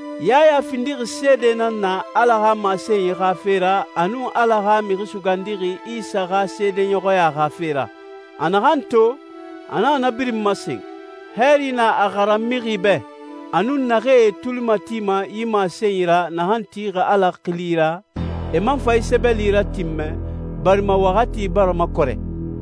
Yaya findixi seede nan na Ala xa masenyi xa fe ra a nun Ala xa Mixi Sugandixi Isa xa seedeɲɔxɔya xa fe ra. A naxan to, a naxa na birin masen. Hɛɛri na a xaran mixi bɛ, a nun naxee e tuli matima yi masenyi ra naxan tixi Ala xili ra, e man fa yi sɛbɛli ratinmɛ, barima waxati bara makɔrɛ.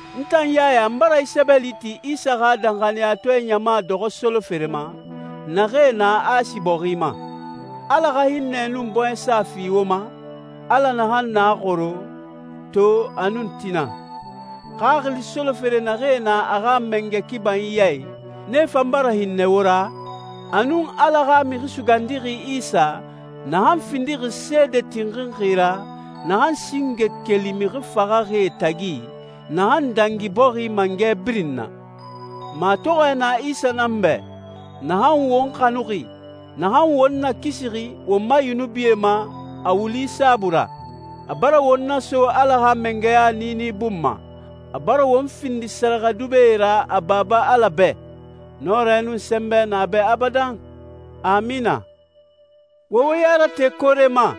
N tan Yaya, n bara yi sɛbɛli ti Isa xa danxaniyatɔɛ ɲama dɔxɔ solofere ma, naxee na Asi bɔxi ma. Ala xa hinnɛ nun bɔɲɛsa fi wo ma, Ala naxan na xoro, to, a nun tina. Xaxili solofere naxee na a xa mangɛ kibanyi ya i, nee fan bara hinnɛ wo ra, a nun Ala xa Mixi Sugandixi Isa, naxan findixi seede tinxinxi ra, naxan singe keli mixi faxaxie tagi, naxan dangi bɔxi mangɛ birin na. Matɔxɔɛ na Isa nan bɛ, naxan won xanuxi, naxan won nakisixi won ma yunubie ma a wuli saabui ra. A bara won naso Ala xa mangɛya niini bun ma, a bara won findi sɛrɛxɛdubɛe ra a Baba Ala bɛ. Nɔrɛ nun sɛnbɛ na a bɛ abadan! Amina. Wo wo ya rate koore ma,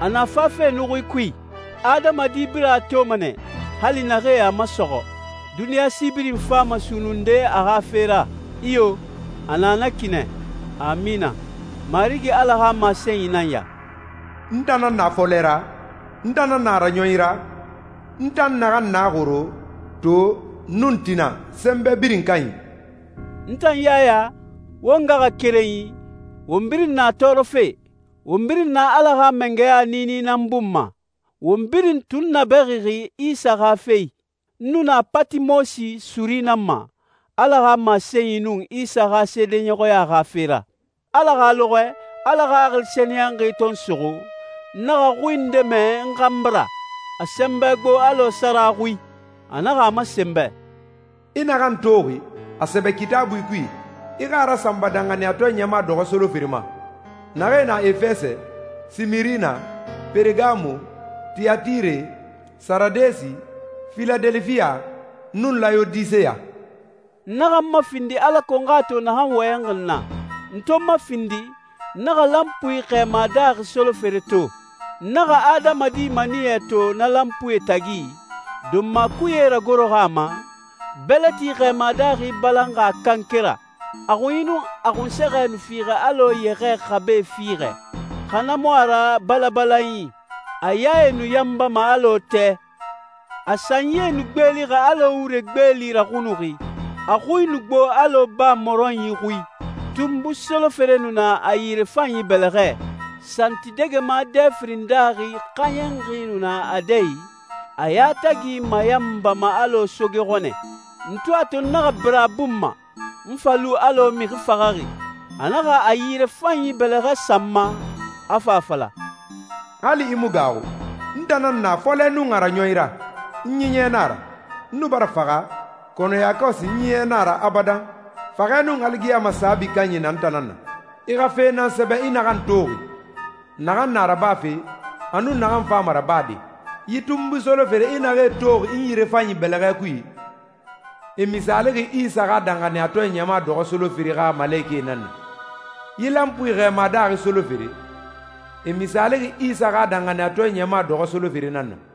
a na fafe nuxuie kui. Adamadi birin a toma nɛ, hali naxee a masɔxɔ. Duniɲa si birin fama sunnunde a xa fe ra. Iyo, a na na ki nɛ. Amina! Marigi Ala xa masenyi nan ya: «N tan nan na a fɔlɛ ra, n tan nan na a raɲɔnyi ra, n tan naxan na xoro, to, nun tina, Sɛnbɛ Birin Kanyi.» N tan Yaya, wo ngaxakerenyi, won birin na tɔɔrɔfe, won birin na Ala xa mangɛya niini nan bun ma, won birin tunnabɛxixi Isa xa fe i. N nu na Patimosi suri nan ma Ala xa masenyi nun Isa xa seedeɲɔxɔya xa fe ra. Ala xa lɔxɔɛ, Ala Xaxili Sɛniyɛnxi to n suxu, n naxa xui nde mɛ n xanbi ra. A sɛnbɛ gbo alɔ sara xui. A naxa a masen n bɛ, «I naxan toxi, a sɛbɛ Kitaabui kui, i xa a rasanba danxaniyatɔɛ ɲama dɔxɔ solofere ma, naxee na Efɛsɛ, Simirina, Peregamo, Tiyatire, Saradesi, Filadelifiya, nun Layodiseya.» N naxa n mafindi alako n xa a to naxan wɔyɛnxi n na. N to n mafindi, n naxa lanpui xɛɛma daaxi solofere to. N naxa adamadi maniyɛ to na lanpuie tagi, donma kuye ragoroxi a ma, bɛlɛti xɛɛma daaxi balanxi a kanke ra. A xunyi nun a xunsɛxɛ nu fiixɛ alɔ yɛxɛɛ xabe fiixɛ, xa na mu a ra balabalanyi. A yae nu yanbama alɔ tɛ. A sanyie nu gbeelixi alɔ wure gbeeli raxunuxi, a xui nu gbo alɔ baa mɔrɔnyi xui. Tunbui solofere nu na a yirefanyi bɛlɛxɛ, santidɛgɛma dɛ firin daaxi xɛɲɛnxi nu na a dɛ i, a yatagi mayanbama alɔ soge xɔnɛ. N to a to n naxa bira a bun ma, n fa lu alɔ mixi faxaxi. A naxa a yirefanyi bɛlɛxɛ sa n ma, a fa a fala, «Hali i mu gaaxu. N tan nan na a fɔlɛ nun a raɲɔnyi ra. N ɲiɲɛ na a ra. N nu bara faxa, kɔnɔ yakɔsi n ɲiɲɛ na a ra abadan. Faxɛ nun aligiyama saabi kanyi na n tan nan na. I xa fe nan sɛbɛ i naxan toxi, naxan na rabafe, a nun naxan fama rabade. Yi tunbui solofere i naxee toxi n yirefanyi bɛlɛxɛ kui, e misaalixi Isa xa danxaniyatɔɛ ɲama dɔxɔ solofere xa malekɛe nan na. Yi lanpui xɛɛma daaxi solofere, e misaalixi Isa xa danxaniyatɔɛ ɲama dɔxɔ solofere nan na.»